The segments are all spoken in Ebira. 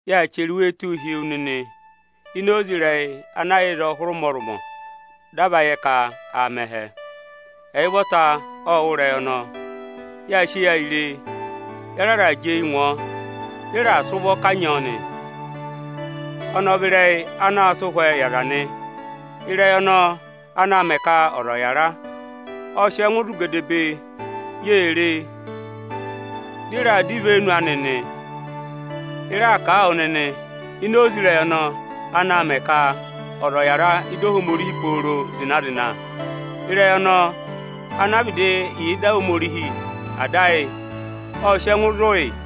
Yaa chẹrẹ iwee tụ́ụ hi wu nịnị ịnị oze ịrẹyị ana yà ịzọọ hụrị ụmọrụmọ, dị a va yẹ ka aa mẹ ẹhẹ. Ẹyị ụvọta ộ wụ́ Ịrẹyị ọnọọ, yáa sị eyi ré e, ya raà jị eyi ngụ ọ, dị ị raà sị ụvọ kanyị ọ nị. Ọnị ọ vị ịrẹyị anaā sịị ụhwẹ yị aza nị. Ịrẹyị ọnọọ anaā mẹ ka ọza ọ̀ yara ộ sị ẹngụ zụ̀ gedebee; Yê ré e, dị ị raa dọ ivenu ani nị. Ị raa kà a wụ nịnị ini oze ịrẹyị ọnọọ anaā mẹ ka ọza yara ịdị Ohomorihi pooro zịna-zịna. Ịrẹyị ọnọọ ana vịdị yà ịdị Ohomorihi Ada ayị ộ sị ẹngụ zụ̀ yị.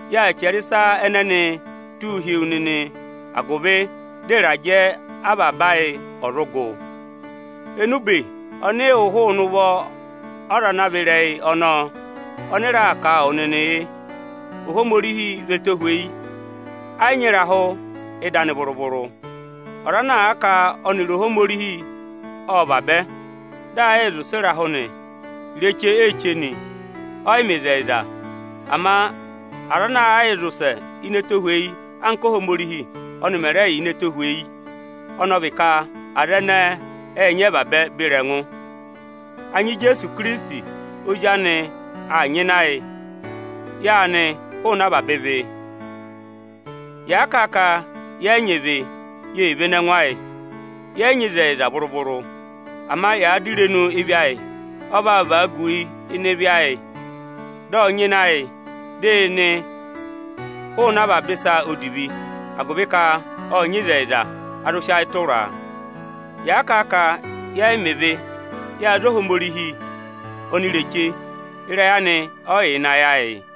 Yaa chẹrẹ ịsa ẹnẹnịị tụ́ụ hi wu nịnị agụvị dị ịrajẹ avaba ayị ọ̀ zụ gụ. Enube ọnị ị wụ́ hụụnị irenu ozi anị ọnọọ ọnị ị raa kà yị wụ nịnị yị: Ohomorihi vị ẹtohweyi, ẹ́ yị nyị etohozi ịdị anị vụrụ-vụrụ. Yàa kà a ka ẹyịrị Ohomorihi ọ́ọ rị vabẹ dị yaā yịị zị ụsẹ ịnị ịrahụ nị, ireche i yee che nị, yẹ́ yị mẹ ịzẹyịza. Ama yàaa zị ụsẹ ini ẹtohweyi anka Ohomorihi ọnị mẹ̀ rẹ yà ini ẹtohweyi, ọnị ọ vị ka yaa mẹ̀ uze vaabẹ beri ẹngụ. Anya Ijeesu Ikirisiti Ozi anị aa nyịna yị; yaa nị hụụnị avaba ịvị. Yàa kà a ka yẹ yị nyị ịvị, i yee vene ẹngụ ayị, yẹ yị nyị ịzẹyịza vụrụ-vụrụ. Ama yàa dọ irenu ịvị ayị, Ọ vaa vagu yị ịnị ịvị ayị, dị ọ nyịna yị, dị ị nị hụụnị avaba ịsa odivi. Agụvị ka ọ́ọ nyị ịzẹyịza, a zụ sị ayị tụra a. Yàa kà a ka yẹ yị mẹ ịvị, yáa za Ohomorihi onireche, ịrẹyị anị ẹ́ yị yà ịnị ayị ayị.